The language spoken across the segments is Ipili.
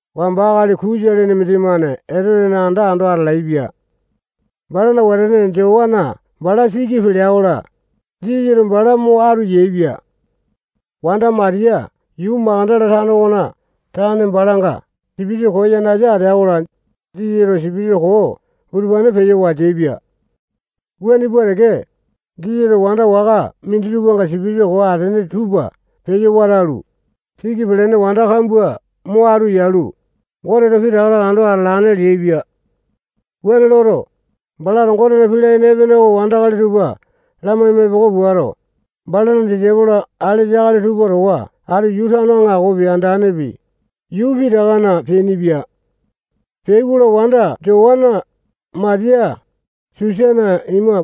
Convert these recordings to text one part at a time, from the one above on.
Wamba akali Kusa lene mindimane Etotena anda ando atalaepia. Balana wetene Jowana bala siki pelea-kola, Jisasato bala mo atu yaepia. Wanda Matiya yuu Makatala tano okona tane balanga sipitisa koo yanasa ateai-kola, Jisasato sipitisa koo utupane peyo wateaipia. Wuane pua teke, Jisasato wanda waka minditupanga sipitisa koo ateane tupa peyo watalu, siki pelene wanda kambua mo atu yalu, Goteto pitaka taka ando atalane leaipia. Wuane loto, balato Gotena pii layene epene oko wandakali tupa lamaima, epoko puato, balana disaipolo alesa akali tupa towa atu tano aŋakopi, andanepi, yuu pitakana peainipia. Peai-kola, wanda Jowana, Matiya, Susana ima,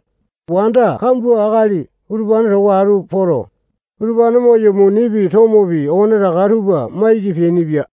wanda kambua akali utupane towa atu poto, utupane moyo, munipi, tomopi, okonetaka tupa maiki peainipia.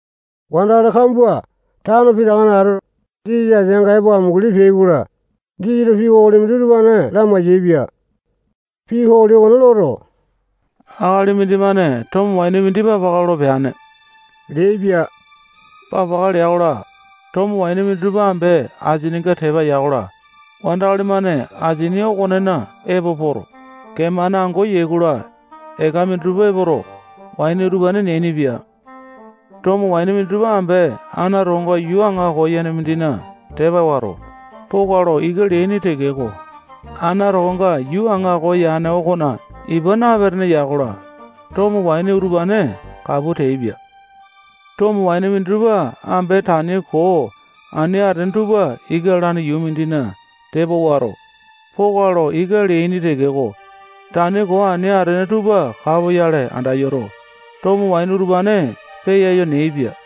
Wandakali kambua tano pitakana atoto, Jisasa ateanga epo amunguli peai-kola, Jisasato pii kokoli mindi utupane lamai-yaepia. Pii kokoli okone loto, akali mindimane tomo waini mindi papaka lolo peane leaipia. Papaka lea-kola, tomo waini minditupa ambe asininga tepa ya-kola, wandakali-mane asini okonena epo poto, kee-mane ango yai-kola, eka minditupa epoto, waini utupane neainipia. Tomo waini minditupa ambe ana tokonga yuu aŋako yane mindina tepa wato, poka lo ika leaini tekeko, ana tokonga yuu aŋako yane okona ipa napetene ya-kola, tomo waini utupane kapu teaipia. Tomo waini minditupa ambe tani koo ani atene tupa ika lalane yuu mindina tepa wato, poka lo ika leaini tekeko, tani koo ani atene tupa kapoyale andayoto, tomo waini utupane peyayo neaipia.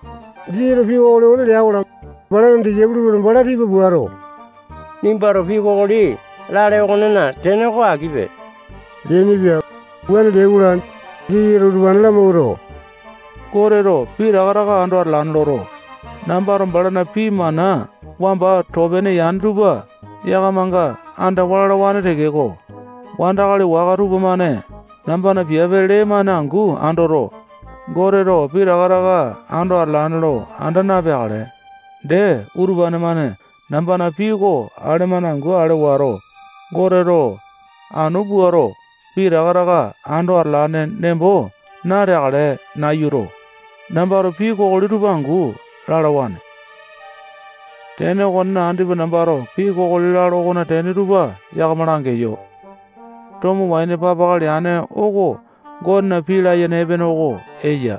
Jisasato pii kokoli okone lea-kola, balana disaipolo tupamane bala tipa puato, nimbato pii kokoli lale okonena tene oko akipe leainipia. Wuane leai-kola, Jisasato utupane lamawuato, Goteto pitaka taka ando atalane loto, nambato balana pii mana wamba too-pene yane tupa yakamanga andawa lalawane tekeko, wandakali waka tupamane nambana piape lee-mane angu andoto, Goteto pitaka taka ando atalane lo anda napeakale. Dee, utupane-mane nambana pii oko ale-mane angu ale wato, Goteto anu puato, pitaka taka ando atalane nembo nateakale nayuto, nambato pii kokoli tupa angu lalawane. Tene okonena, andipa nambato pii kokoli lalo okona tene tupa yakama langeyo. Tomo waini papaka leane oko Gotena pii layene epene oko eya.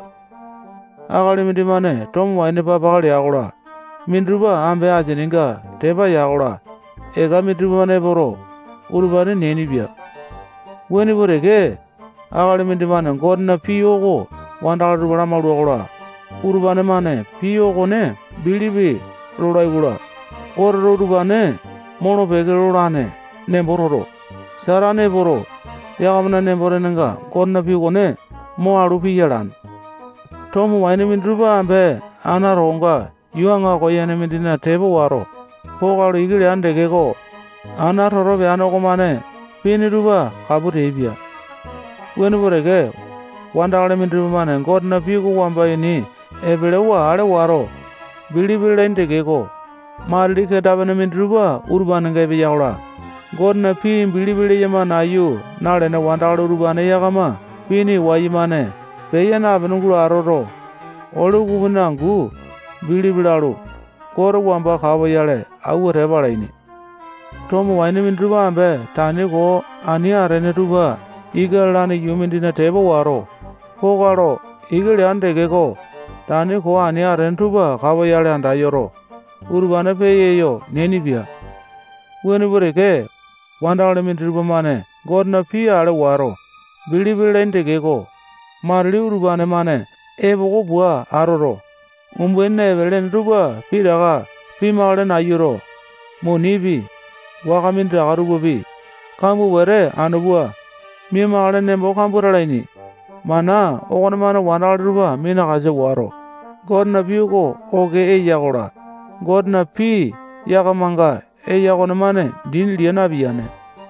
Akali mindimane tomo waini papaka lea-kola, minditupa ambe asinginga tepa ya-kola, eka minditupa epoto, utupane neainipia. Wuane pua teke, akali mindimane Gotena pii oko wandakali tupa lamaula-kola, utupane-mane pii okone bilipi lolai-kola, Goteto utupane molo-peke lolane nembo toto, Satane epoto, yakamana nembo-tenenga Gotena pii okone mo alu piya alane. Tomo waini minditupa ambe ana tokonga yuu aŋako yane mindina tepa wato, poka lo ika leane tekeko, ana toto peane okomane pini tupa kapu teaipia. Wuane pua teke, wandakali minditupa-mane Gotena pii oko wamba ini epelewa ale wato, bilipi lalaini tekeko, matili kenda-pene minditupa utupanenga epeya-kola, Gotena pii bilipi leyama nayu nalene wandakali utupane yakama pini wayumane peya napene gulo atoto, ole ukupini angu bilipi lalu, Gote wamba kapoyale awua tepa alaini. Tomo waini minditupa ambe tani koo ani atene tupa ika lalane yuu mindina tepa wato, poka lo ika leane tekeko, tani koo ani atene tupa kapoyale anda yoto, utupane peyayo neainipia. Wuane pua teke, wandakali minditupa-mane Gotena pii ale wato, bilipi lalaini tekeko, matili utupane-mane epoko pua atoto, umbainina epele-ene tupa pitaka pimakale nayuto, munipi, waka minditaka tupapi, kambua wete anu pua, mia-makale nembo kambua talaini. Mana okonemane wandakali tupa minakasa wato, Gotena pii oko oke eya-kola, Gotena pii yakamanga eya okomane dini lia napiyane.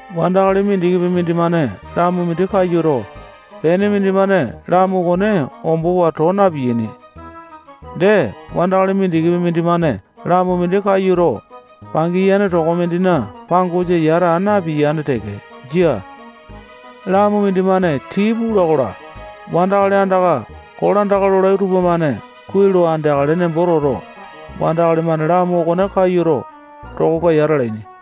Wandakali mindikipi mindimane lamu mindi kayuto, pene mindimane lamu okone ombowa too na-piyaini. Dee, wandakali mindikipi mindimane lamu mindi kayuto, pangiyane toko mindina pangosa yata aa napiyane teke. Jia. Lamu mindimane tii pula-kola, wandakali andaka kolandaka lolai tupamane kuai lo andeakale nembo toto, wandakali-mane lamu okone kayuto, tokonga yata alaini.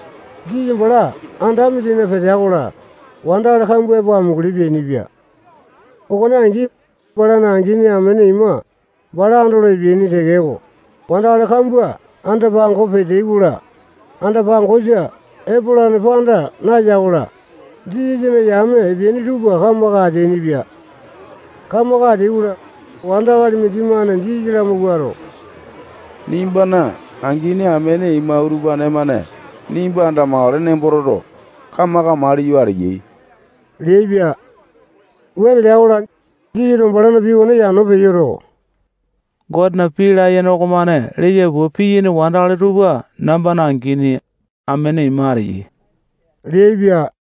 Jisasa bala anda mindina petea-kola, wandakali kambua epo amunguli peainipia. Okone angi, balana angini, amene ima, bala andolo epeaini tekeko, wandakali kambua anda-pango peteai-kola, anda-pangosa epolane panda naya-kola, Jisasana yame epeaini tupa kamaka ateainipia. Kamaka ateai-kola, wandakali mindimane Jisasa lamawuato, nimbana angini amene ima utupane-mane nimba andamakale nembo toto, kamaka maliyo ateyai leaipia. Wuane lea-kola, Jisasato balana pii okone yano peyoto, Gotena pii layene okomane leya pua piyaini wandakali tupa nambana angini, amene ima ateyai leaipia.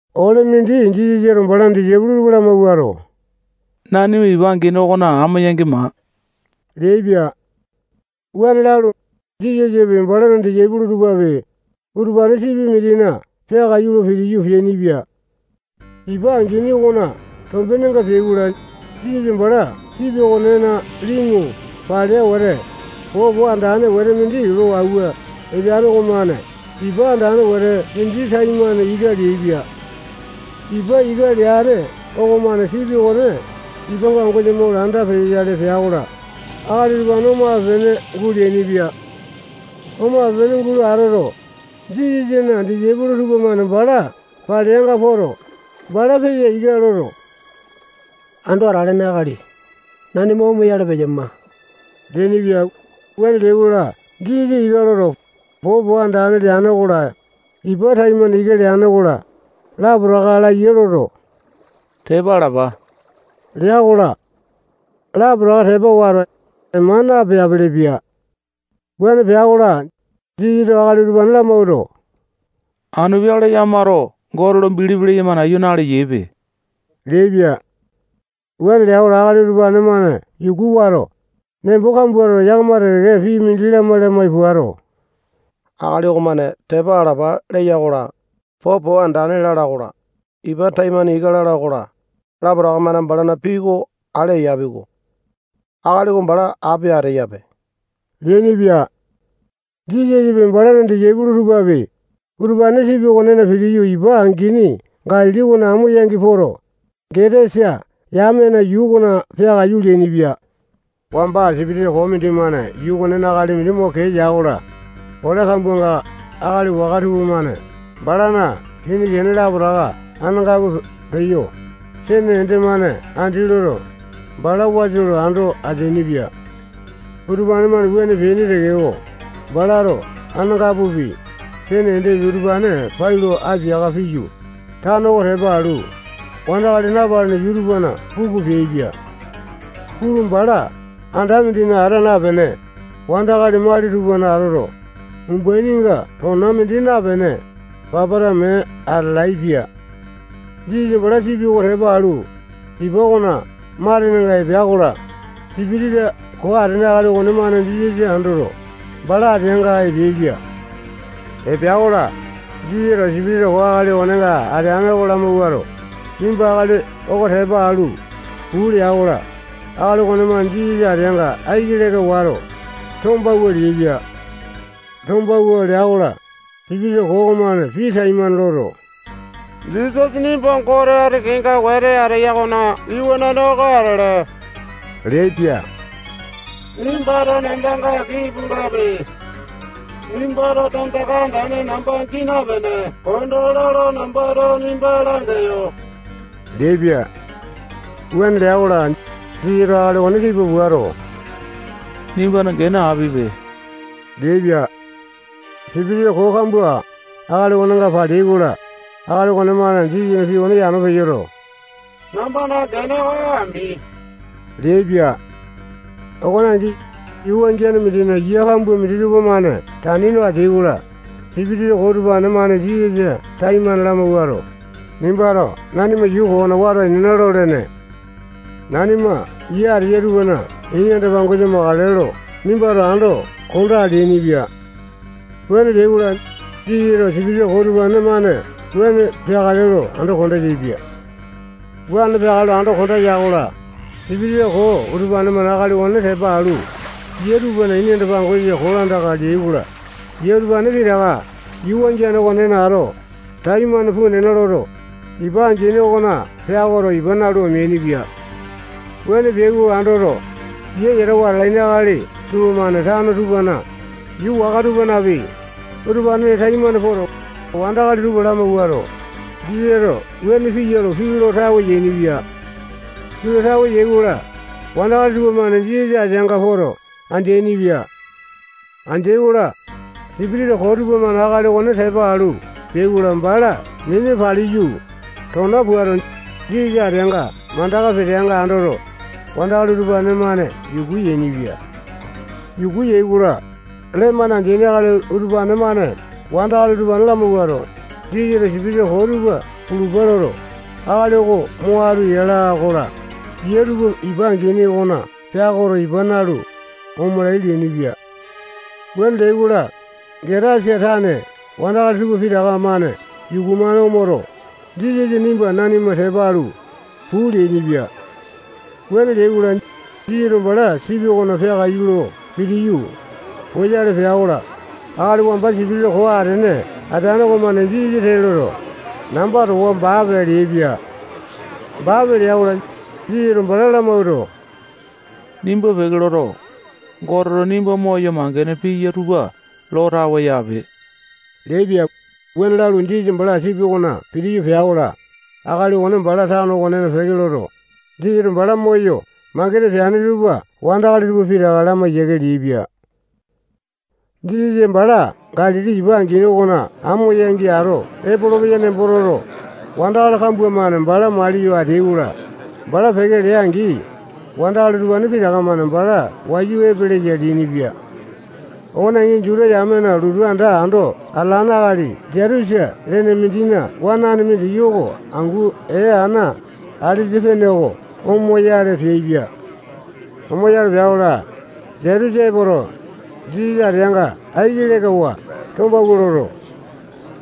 Ole mindi Jisasato balana disaipolo tupa lamawuato, nanima ipa angini okona amo yangi maa leaipia. Wuane lalu, Jisasapi, balana disaipolo tupapi, utupane sipi mindina peakaiyu lo pitiyu, peainipia. Ipa angini okona tombenga peai-kola, Jisasa bala sipi okonena limu palea wete, popo andane wete mindi lo awua epeane okomane ipa andane wete mindi taimane ika leaipia. Ipa ika leane okonemane sipi okone ipa pangosa mo landa peyoyale pea-kola, akali utupane omape-pene guleainipia. Omape-pene gulo atoto, Jisasana disaipolo tupamane bala paleanga poto, bala peya ika loto, Ando Atalene Akali, nanima omoyale peyama leainipia. Wuane leai-kola, Jisasa ika loto, popo andane leane okola, ipa taimane ika leane okola, lapotaka laya loto, tepa alapa lea-kola, lapotaka tepa wato, ema napeapele-pia. Wuane pea-kola, Jisasato akali utupane lamawuato, anu peakale yakamato Gote lo bilipi leyama nayu naleyaipe leaipia. Wuane lea-kola, akali utupane-mane yuku wato, nembo kambua toto, yakama teke-teke pii mindi lamai-lamai puato, akali okomane tepa alapa leya-kola, popo andane lala okola, ipa taimane ika lala okola, lapotaka-mane balana pii oko ale eyapi-ko. Akali oko bala api ateyape leainipia. Jisasapi, balana disaipolo tupapi, utupane sipi okonena pitiyu, ipa angini Galili okona amo yangi poto, Getasa yamena yuu okona peakaiyu leainipia. Wamba sipitisa koo mindimane yuu okonena akali mindi mo kee ya-kola, ole kambuanga akali waka tupamane balana kini kene lapotaka anangapu peyo, sene ende-mane andi loto, bala wasa lo ando ateainipia. Utupane-mane wuane peaini tekeko, balato anangapupi, sene endepi, utupane pai lo apiaka piyu, tano oko tepa alu, wandakali napalene yuu tupana puku peaipia. Pulu, bala anda mindina ata napene, wandakali mali tupana atoto, umbaininga tona mindi napene, papata mee atalaepia. Jisasa bala sipi oko tepa alu, ipa okona matenenga epea-kola, sipitisa koo atene akali okonemane Jisasa andoto, bala ateanga epeaipia. Epea-kola, Jisasato sipitisa koo akali okonenga ateane oko lamawuato, nimba akali oko tepa alu, puu lea-kola, akali okonemane Jisasa ateanga aiki leka wato, tombawua leaipia. Tombawua lea-kola, sipitisa koo okomane pii taimane loto, Jisasa nimba Gote ati kenga wete ateya okona Iwanane oko atele leaipia. Nimbato nambanga aki pulape. Nimbato tandaka andane namba gii napene konda ola lo nambato nimba langeyo leaipia. Wuane lea-kola, Jisasato akali okone tipa puato, nimbana gene apipe leaipia. Sipitisa koo kambua akali okonenga paleai-kola, akali okonemane Jisasana pii okone yano peyoto, nambana gene oko ami leaipia. Okone angi, yuu wangiane mindina yia kambua minditupa-mane tani no ateai-kola, sipitisa koo utupane-mane Jisasa taimane lamawuato, nimbato nanima yuu koo okona wato ainena lolene. Nanima yia ateya utupana ini anda-pangosa makale lo nimbato ando kondaa leainipia. Wuane leai-kola, Jisasato sipitisa koo utupane-mane wuane peakale lo ando konda yaepia. Wuane peakale lo ando konda ya-kola, sipitisa koo utupane-mane akali okone tepa alu, yia tupana ini anda-pangosa kolandaka leai-kola, yia utupane pitaka yuu wangiane okonena ato, taimane puu nena loto, ipa angini okona peakoto, ipa nalu, omeainipia. Wuane peai oko andoto, yia yatawa atalaini akali tupamane tano tupanapi, yuu waka tupanapi, utupanena taimane poto, wandakali tupa lamawuato, Jisasato wuane piya lo pii lo tawe yainipia. Pii lo tawe yai-kola, wandakali tupamane Jisasa ateanga poto andeaini-pia. Andeai-kola, sipitisa koo tupamane akali okone tepa alu peai-kola, bala mini paliyu, tona puato, Jisasa ateanga mandaka peteainga andoto, wandakali utupane-mane yuku yainipia. Yuku yai-kola, lee-mane andeaini akali utupane-mane wandakali utupane lamawuato, Jisasato sipitisa koo tupa pulupa loto, akali okone mo atu yala-kola, yia tupa ipa angini okona peakoto, ipa nalu, omalai leainipia. Wuane leai-kola, Getasa tane wandakali tupa pitaka-mane yuku-mane omoto, Jisasa nimba nanima tepa alu, puu leainipia. Wuane leai-kola, Jisasa bala sipi okona peakaiyu lo pitiyu, poyale pea-kola, akali wamba sipitisa koo atene ateane okomane Jisasa tee loto, namba towa baape leaipia. Baape lea-kola, Jisasato bala lamawuato, nimba peke loto, Goteto nimba moyo mangene piya tupa lo tawe yaape leaipia. Wuane lalu, Jisasa bala sipi okona pitiyu pea-kola, akali okone bala tano okona peke loto, Jisasato bala moyo mangene peane tupa wandakali tupa pitaka lamai yiake leaipia. Jisasa bala Galili ipa angini okona amo yangi ato epolopeya nembo toto, wandakali kambua-mane bala maliyo ateai-kola, bala peke lea-angi, wandakali utupane pitaka-mane bala wayu epeleya leainipia. Okone angi, Juta yamena lotu anda ando atalane akali Jaitusa lene mindina wanane mindiki oko angu ee ana alesa pene oko omoyale peaipia. Omoyale pea-kola, Jaitusa epoto, Jisasa ateanga aiki lekawa tombawua loto,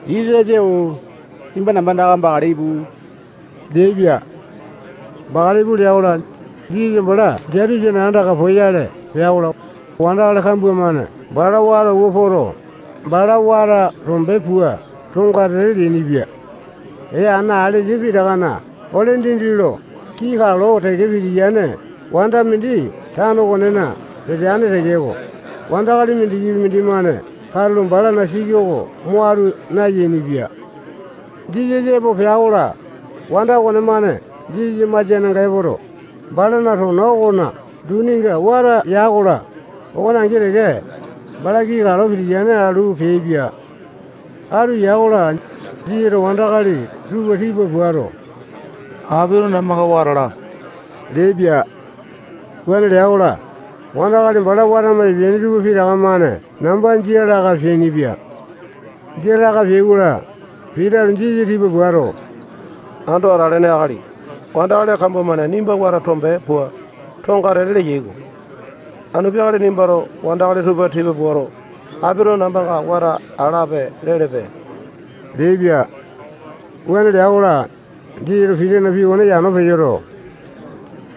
Jisasa-o-o, nimba namba andaka bakale ipu leaipia. Bakale ipu lea-kola, Jisasa bala Jaitusana andaka poyale pea-kola, wandakali kambua-mane bala wata awua poto, bala wata tombe pua tongatete leainipia. Ee ana alesa pitakana ole dindi lo kii kalo teke pitiyane wanda mindi tano okonena peteane tekeko, wandakali mindikipi mindimane katulo balana siki oko mo atu nayainipia. Jisasa epo pea-kola, wanda okonemane Jisasana masianga epoto, balana tona okona duninga wata ya-kola, okone angi teke, bala kii kalo pitiyane alu peaipia. Atu ya-kola, Jisasato wandakali tupa tipa puato, apito nambanga wata alape leaipia. Wuane lea-kola, wandakali bala watama epeaini tupa pitaka-mane namba jia laka peainipia. Jia laka peai-kola, Pitato Jisasa tipa puato, Ando Atalene Akali, wandakali kambua-mane nimba wata tombe pua, tongatete leyai-ko. Anu peakale nimbato wandakali tupa tipa puato, apito nambanga wata alape lelepe leaipia. Wuane lea-kola, Jisasato Pitana pii okone yano peyoto,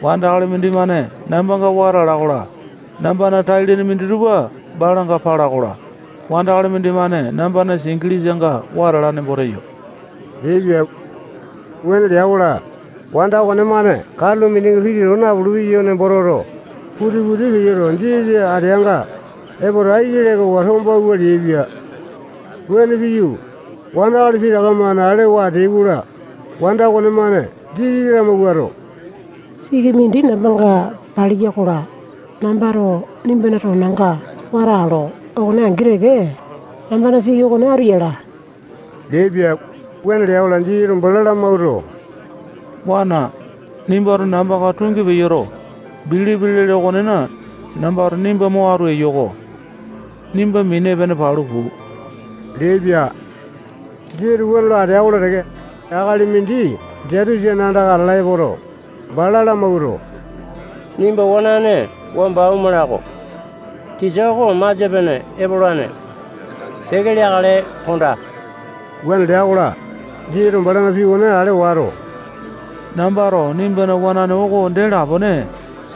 wandakali mindimane nambanga wata ala-kola, nambana tai-lene minditupa balanga pala-kola, wandakali mindimane nambana singilisanga wata ala nembo teyo leaipia. Wuane lea-kola, wanda okonemane katulo mindinga piti too napulu-peyawa nembo toto, putiti peyoto, Jisasa ateanga epoto, aiki lekawa tombawua leaipia. Wuane piyu, wandakali pitaka-mane alewa ateai-kola, wanda okonemane Jisasa lamawuato, siki mindi nambanga paliya-kola, nambato nimbana tonanga wata alo okone angi teke, nambana siki okone atu yala leaipia. Wuane lea-kola, Jisasato bala lamawuato, wana, nimbato nambanga tungi peyoto, bilipi lele okonena, nambato nimba mo atu eyo-ko. Nimba mini epene palu puu leaipia. Jisasato wuane lo atea-kola teke, akali mindi Jaitusana andaka atala epoto, bala lamawuato, nimba wanane wamba omala-ko. Tisa oko masia-pene epolane. Peke leakale kondaa. Wuane lea-kola, Jisasato balana pii okone ale wato, nambato nimbana wanane oko dee lapone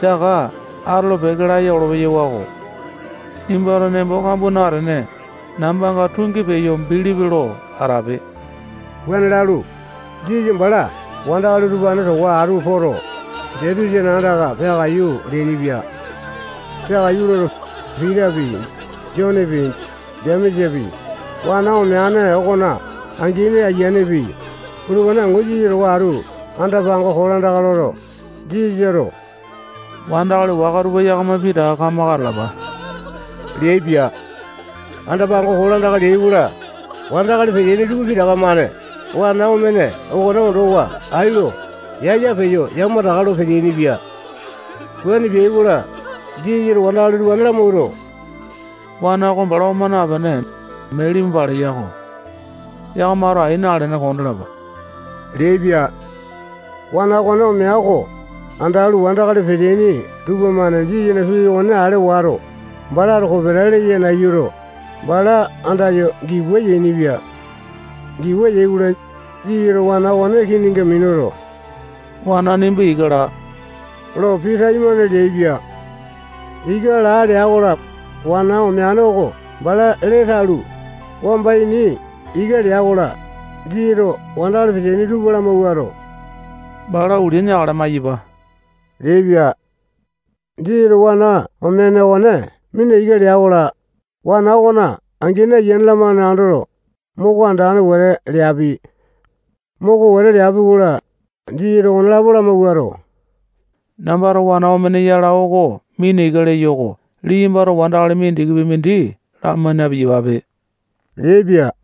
saka atolo-peke laya olo-peyawako. Nimbato nembo kambua natene, nambanga tungi peyo bilipi lo atape. Wuane lalu, Jisasa bala wandakali utupane towa atu poto, Jaitusana andaka peakaiyu leainipia. Peakaiyu loto, Pitapi, Jonepi, Jemesapi, wana omeane okona angini ayianepi, utupane angu Jisasa towa atu anda-pango kolandaka loto, Jisasato wandakali waka tupa yakama pitaka kamaka atalapa leaipia. Anda pango kolandaka leai-kola, wandakali peteaini tupa pitaka-mane wana omene okone ondowa ai lo yaya peyo yamataka lo peteaini-pia. Wuane peai-kola, Jisasato wandakali utupane lamawuato, wana oko bala oma napene, mee limu paleya-ko. Yakamato ai nalene kondalapa leaipia. Wana okone omea oko andalu, wandakali peteaini tupamane Jisasana pii okone ale wato, balato kopeta leya nayuto, bala andayo giwa yainipia. Giwa yai-kola, Jisasato wana oko kininga minuto, wana nimba ika laa lo pii taimane leaipia. Ika laa lea-kola, wana omene oko bala lee talu, wamba ini ika lea-kola, Jisasato wandakali peteaini tupa lamawuato, bala ulia neakale maiyapa leaipia. Jisasato wana omene okone mina ika lea-kola, wana okona angini, ayiane-lamane andoto, moko andane wete leapi. Moko wete leapi-kola, Jisasato okonelapo lamawuato, nambato wana omene yala oko mina ika leyo oko liyambato wandakali mindikipi mindi lamai na-piyapape leaipia.